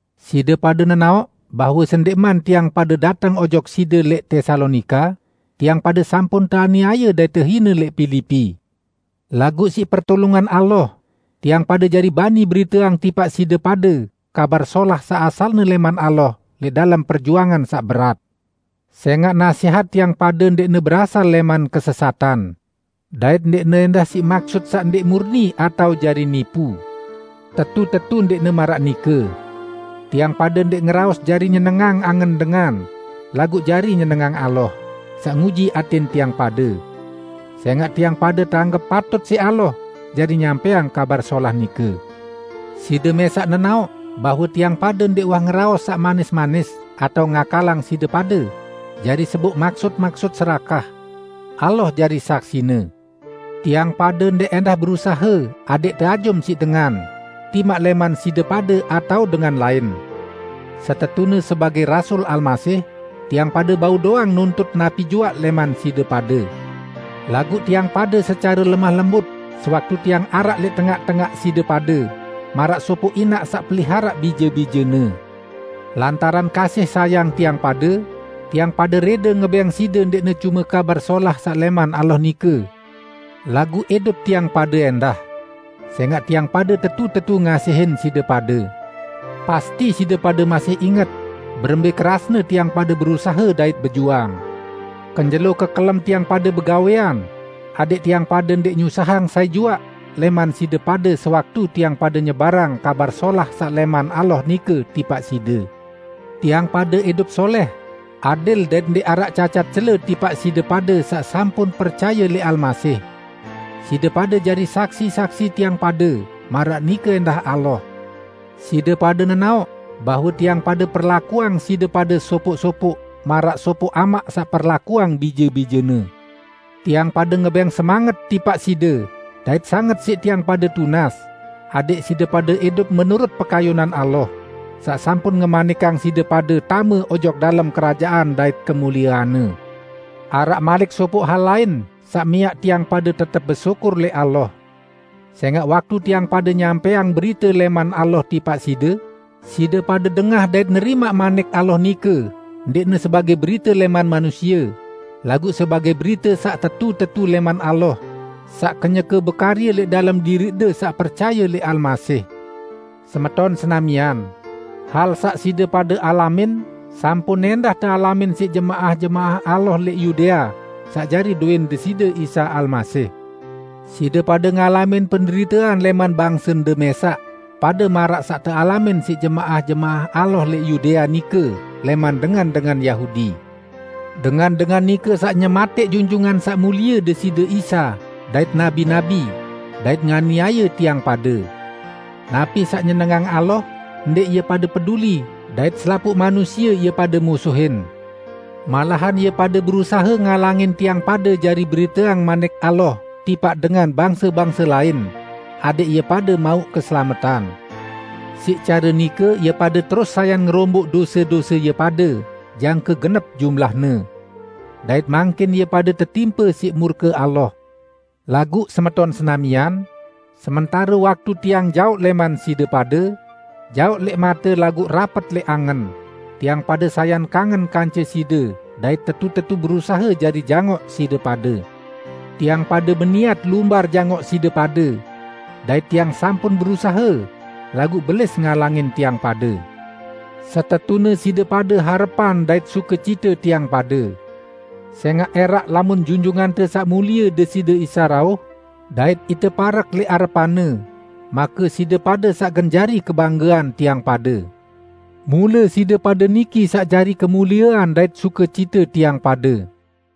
Side pade nenaoq bahwe sendẽqman tiang pade dateng ojok side lẽq Tesalonika, tiang pade sampun teaniaye dait tehine lẽq Pilipi. Laguq siq pertulungan Allah, tiang pade jari bani beriteang tipaq side pade Kabar Solah saq asalne lẽman Allah lẽq dalem perjuangan saq berat. Sẽngaq nasẽhat tiang pade ndẽqne berasal lẽman kesesatan; dait ndẽqne ẽndah siq maksut saq ndẽq murni atao jari nipu. Tetu-tetu ndẽqne maraq nike! Tiang pade ndẽq ngeraos jari nyenengang angen dengan, laguq jari nyenengang Allah, saq nguji atẽn tiang pade. Sẽngaq tiang pade teanggep patut siq Allah jari nyampẽang Kabar Solah nike. Side mẽsaq nenaoq bahwe tiang pade ndẽq uwah ngeraos saq manis-manis atao ngakalang side pade jari seboq maksut-maksut serakah. Allah jari saksine! Tiang pade ndẽq ẽndah berusahe adẽq teajum siq dengan -- timaq lẽman side pade atao dengan lain. Setetune sebagẽ rasul Almasih, tiang pade bau doang nuntut napi juaq lẽman side pade. Laguq tiang pade secare lemah lembut sewaktu tiang araq lẽq tengaq-tengaq side pade, maraq sopoq inaq saq peliharaq bije-bijene. Lantaran kasih sayang tiang pade, tiang pade rẽde ngebẽng side ndẽqne cume Kabar Solah saq lẽman Allah nike, laguq idup tiang pade ẽndah. Sẽngaq tiang pade tetu-tetu ngasihin side pade! Pasti side pade masih inget berembẽ kerasne tiang pade berusahe dait bejuang. Kenjelo kekelem tiang pade begawẽan adẽq tiang pade ndẽq nyusahang sai juaq lẽman side pade sewaktu tiang pade nyebarang Kabar Solah saq lẽman Allah nike tipaq side. Tiang pade idup solẽh, adil dait ndẽq araq cacat cele tipaq side pade saq sampun percaye lẽq Almasih. Side pade jari saksi-saksi tiang pade, maraq nike ẽndah Allah. Side pade nenaoq bahwe tiang pade perlakuang side pade sopoq-sopoq maraq sopoq amaq saq perlakuang bije-bijene. Tiang pade ngebẽng semanget tipaq side dait sanget siq tiang pade tunas adẽq side pade idup menurut pekayunan Allah, saq sampun ngemanikang side pade tame ojok dalem kerajaan dait kemuliean-Ne. Araq malik sopoq hal lain saq miaq tiang pade tetep besyukur lẽq Allah. Sẽngaq waktu tiang pade nyampẽang berite lẽman Allah tipaq side, side pade dengah dait nerimaq Manik Allah nike ndẽqne sebagẽ berite lẽman manusie, laguq sebagẽ berite saq tetu-tetu lẽman Allah, saq kenyeke bekarye lẽq dalem diriqde saq percaye lẽq Almasih. Semeton senamian, hal saq side pade alamin sampun ẽndah tealamin siq jemaah-jemaah Allah lẽq Yudea saq jari dowẽn Deside Isa Almasih. Side pade ngalamin penderitean lẽman bangsende mẽsaq, pade maraq saq tealamin siq jemaah-jemaah Allah lẽq Yudea nike lẽman dengan-dengan Yahudi. Dengan-dengan nike saq nyematẽq Junjungan Saq Mulie Deside Isa dait nabi-nabi, dait nganiaye tiang pade. Napi saq nyenengang Allah ndẽq ie pade peduli dait selapuq manusie ie pade musuhin. Malahan ie pade berusahe ngalangin tiang pade jari beriteang Manik Allah tipaq dengan bangse-bangse lain adẽq ie pade mauq keselametan. Siq care nike ie pade terus sayan ngeromboq dose-dose ie pade jangke genep jumlahne. Dait mangkin ie pade tetimpe siq murke Allah. Laguq semeton senamian, sementare waktu tiang jaoq lẽman side pade -- jaoq lẽq mate laguq rapet lẽq angen -- tiang pade sayan kangen kance side dait tetu-tetu berusahe jari jangoq side pade! Tiang pade beniat lumbar jangoq side pade; dait tiang sampun berusahe, laguq Belis ngalangin tiang pade. Setetune side pade harepan dait sukecite tiang pade. Sẽngaq ẽraq lamun Junjungante Saq Mulie Deside Isa rauh, dait ite parek lẽq arepan-Ne, make side pade saq gen jari kebanggean tiang pade. Mule side pade niki saq jari kemuliean dait sukecite tiang pade.